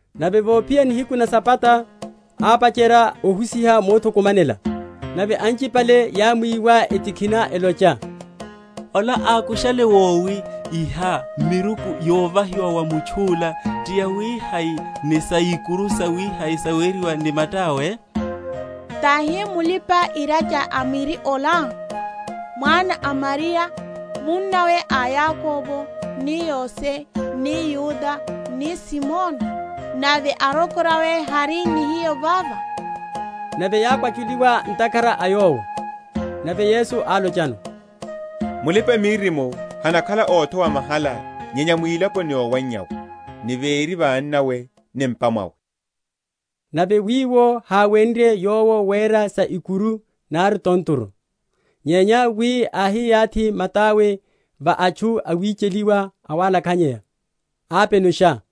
Nave vophiya nihiku na Sabata, ápacherya ohusiha mothukumanela; nave anchipale yámwiwa, etikhina, elocha, Ola ákushale wowi iha; miruku yovahiwa wa mutchu’la ti yawihai ni sa ikuru sawihiha saweriwa ni mata’we? Tahi mulipa‐iracha a miri ola, mwana a Mariya, munnawe a Yakobo ni Yose ni Yuda ni Simoni? Nave arokorawe hari ni hiyo vava? Nave yákwachuliwa ntakhara a Yowo. Nave Yesu álochano, Mulipa‐miririmo hanakhala othowa mahala nyenya mwilaponi yowannyawe, ni véri va annawe ni m’pa mwawe. Nave wiwo háwenrye Yowo wera sa ikuru nari tontoru, nyenya wi áhiyathi mata’we va atchu awicheliwa awalakhanyeya, ápenusha.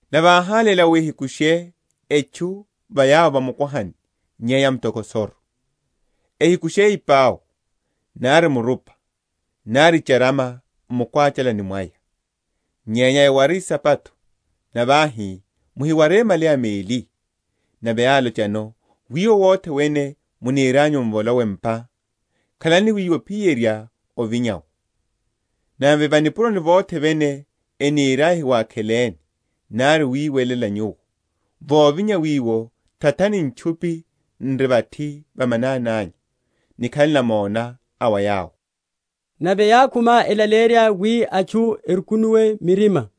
nave áháléla wi ehikushe etchu ya va mukwahani nyenya mutokosoru; ehikushe ipau, nari murupa, nari icharama m’mukwachalani mwaya; nyenya eware isapato; nave áhi muhiware malaya meli. Nave álochano, Wiwo wothe wene munirianyu m’volowe m’pa, khalani wiwo ophiyerya ovinya’wo. Nave va nipuroni vothe vene eniriaya ehiwakheleni, nari wiwelela nyuwo, vovinya wiwo, tathani ntchupi n’ri vathi va manani anyu, nikhale namona a wa yawo. Nave yákhuma elaleyerya wi atchu erukunuwe m’mirima.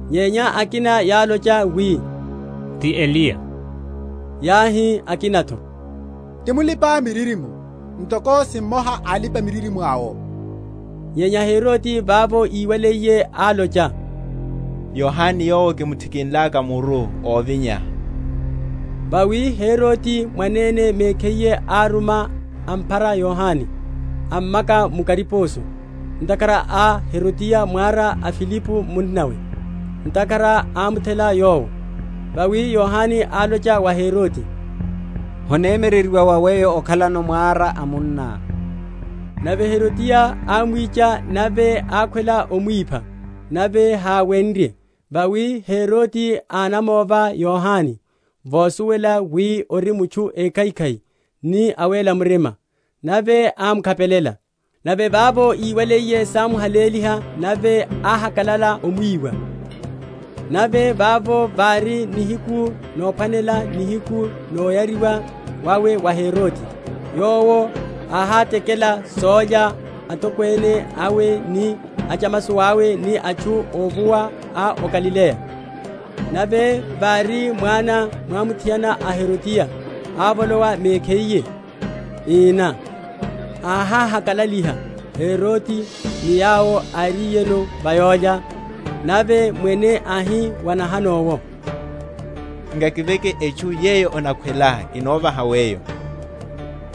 Nyenya akina yálocha wi, Ti Eliya. Yáhi akina’tho. Ti mulipa‐miririmo, ntoko si mmoha a alipa‐miririmo awo. Nyenya Herode vavo íwaliye, álocha, Yohane yowo kimuthikinlaka muru, óvinya. Vawi Herode, mwanene mekhiye áruma, amphara Yohane, ammaka mu kariposo, ntakhara a Herodiya mwara a Filipo munnawe; ntakhara ámuthela yowo. Vawi Yohane álocha wa Herode, Honemyereryiwa wa weyo okhalano mwara a munná. Nave Herodiya ámwicha nave ákhwela omwipha; nave háwenrye; vawi Herode ánamova Yohane, vosuwela wi ori mutchu ékhaikhai ni awéla murima, nave ámukhapelela. Nave vavo íwaliye, sámuhaléliha nave áhakalala omwiwa. Nave vavo vári nihiku nophwanela, nihiku noyariwa wawe wa Herode, yowo áhátekela sólya atokwene awe ni achamasowa awe ni atchu óvuwa a o Galileya; nave vári mwana mwamuthiana a Herodiya ávolowa mekhiye, ína, áhakalaliha Herode ni yawo áriyeno va sólya; nave mwene áhi wa nahano’wo, Nkakiveke etchu yeyo onakhwelá, kinovaha weyo.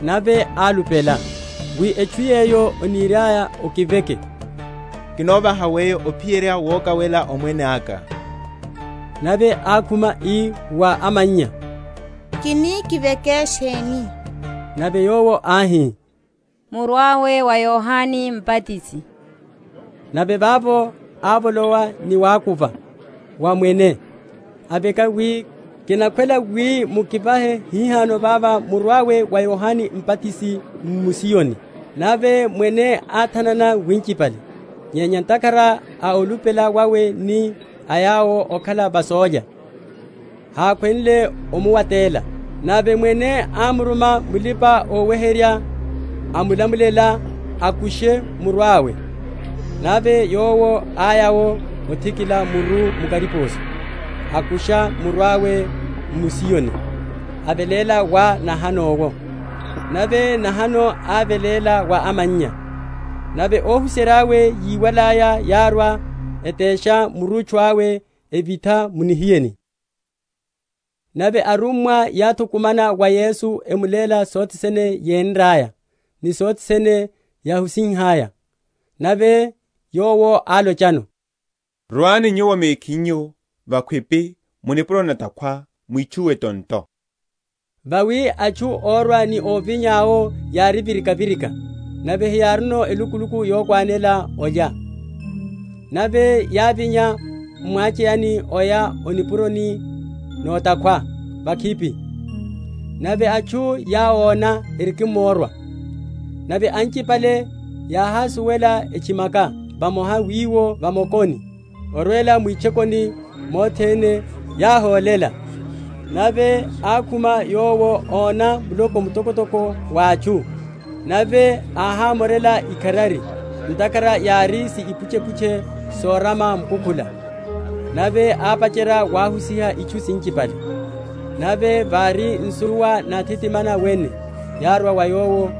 Nave álupela, wi etchu yeyo oniriá okiveke, kinovaha weyo ophiyerya wokawela omwene aka. Nave ákhuma, ii wa amannya, Kini kiveke sheni? Nave yowo áhi, Muru awe wa Yohane Mbatisi. Nave vavo ávolowa ni wakuva wa mwene, aveka wi, Kinakhwela wi mukivahe hihano vava muru awe wa Yohane Mbatisi m’musiyoni. Nave mwene áthanana winchipale; nyenya ntakhara a olupela wawe ni a yawo ókhala va sólya, hákhwenle omuwatela. Nave mwene ámuruma mulipa‐oweherya, amulamulela akushe muru awe; nave yowo áya’wo, athikila muru mu kariposo; akusha muru awe m’musiyoni, aveléla wa nahano’wo; nave nahano áveléla wa amannya. Nave óhuserya’we yíwalaya, yárwa etesha murutchu awe, evitha mu nihiyeni. Wachererya ipau. Nave arummwa yáthukumana wa Yesu; emuléla sothene yénraya, ni sothene yáhusihalaya. Nave Yowo álochano, Rwani nyuwo mekhinyu vakhwipi mu nipuroni na’takhwa, mwitchuwe tonto. Vawi atchu órwa ni óvinya’wo yári virika‐virika, nave heyárino elukuluku yokhwanela olya. Nave yávinya m’mwacheyani oya o nipuroni na’takhwa vakhwipi. Nave atchu yáwona erikimrowa, nave anchipale yáhásuwela, etchimakela vamoha wiwo va mokoni, orwela mwitchokoni mothene, yáhólela. Nave ákhuma Yowo, óna muloko mtokotoko wa atchu, nave áhámorela ikharari, ntakhara yári si ipuchepuche sorama mukukhula; nave ápacherya wahusiha itchu sinchipale. Nave vári nsuwa náthitimana wene, yárwa wa Yowo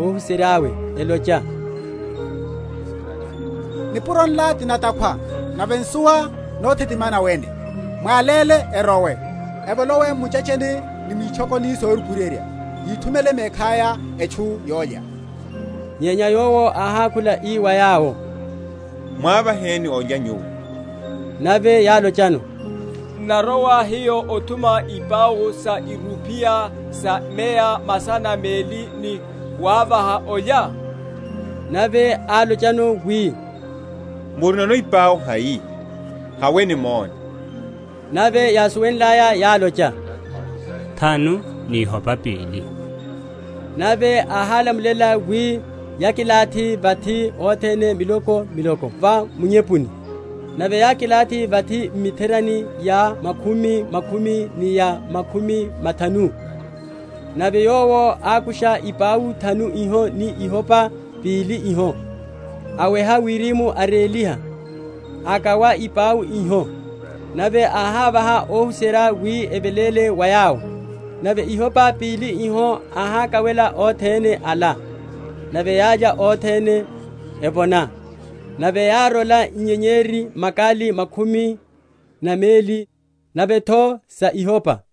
óhuserya’we elocha, Nipuro nla ti na’takhwa nave nsuwa nothitimana wene; mwáléle erowe, evolowe m’michetcheni ni mwitchokoni sorukuryerya, yithumele mekhaya etchu yólya. Nyenya Yowo áhákhula, ii wa yawo, Mwavaheni olya nyuwo. Nave yálochano, N’narowa hiyo othuma ipau sa irupiya sa meya masana meli, ni wavaha olya? Nave álochano wi, Murinono ipau hai? haweni mone. Nave yásuwenlaya, yálocha, Thanu ni ihopa pili. Nave áhálamulela wi yakilathihe vathi othene, miloko miloko va munyepuni. Nave yákilathi vathi m’mitherani ya makhumi khumi ni ya makhumi mathanu. Nave Yowo ákusha ipau thanu iho ni ihopa pili iho, aweha wirimu, aréliha, akawa ipau iho, nave áhávaha óhuserya wi eveléle wa yawo; nave ihopa pili iho áhákawela othene ala. Nave yálya othene, evona. Nave yárola inyenyeri, makali khumi na meli, nave’tho sa ihopa.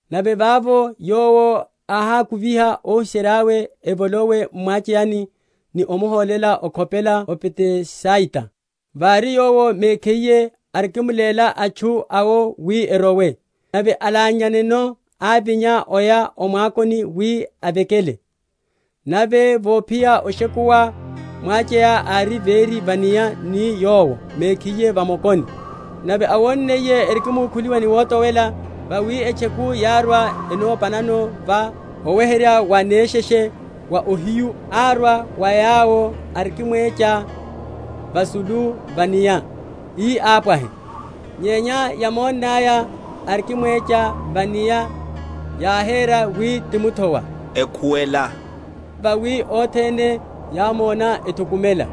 Nave vavo Yowo áhákuviha óhuserya’we evolowe m’mwacheyani ni omuhólela okhopela o Bethsaida, vári Yowo mekhiye arikimuléla atchu awo wi erowe. Nave alanyanneno ávinya, aya o mwakoni wi avekele. Nave vophiya oshekuwa mwacheya ári véri va’nia ni Yowo mekhiye va mokoni. Nave áwonniye erikimukhuliwa ni wotowela, vawi etcheku yárwa enopanano, va oweherya wa nesheshe wa ohiyu árwa wa yawo arikimwecha vasulu va’nia, ii ápwahe; nyenya yámonnaya arikimwecha va’nia, yáhera wi ti muthowa, ekhuwela; vawi othene yámona, ethukumela.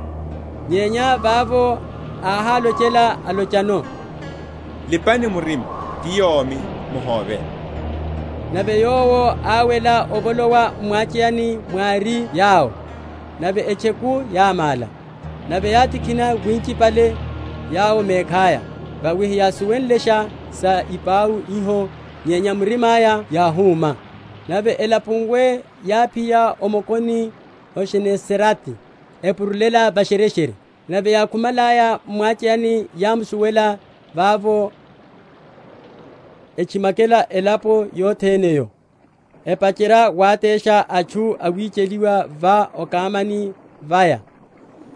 Nyenya vavo áhálochela alochano, Lipani murima; ti yomi, muhóve. Nave Yowo áwela, avolowa m’mwacheyani mwári yawo, nave etcheku yámála; nave yátikhina winchipale yawo mekhaya; vawi heyásuwenlesha sa ipau iho nyenya mirima’ya yáhuma. Nave elapuiye yáphiya o mokoni o Genesarete, epurulela va’shereshere. Nave yákhumalaya m’mwacheyani yámsuwela vavo, etchimakela elapo yothene’yo, epacherya watesha atchu awicheliwa va okamani vaya,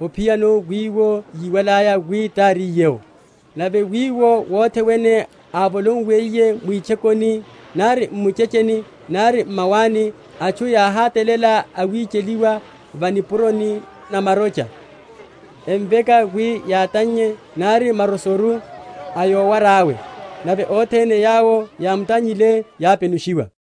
ophiyano wiwo yíwalaya wi táriye’wo. Nave wiwo wothe wene ávolowiye mwitchokoni, nari m’michetcheni nari m’mawani, atchu yáhátalela awicheliwa va nipuroni na marocha, emveka wi yatannye nari marosoru a yowara’we; nave othene yawo yámutannyile yápenushiwa.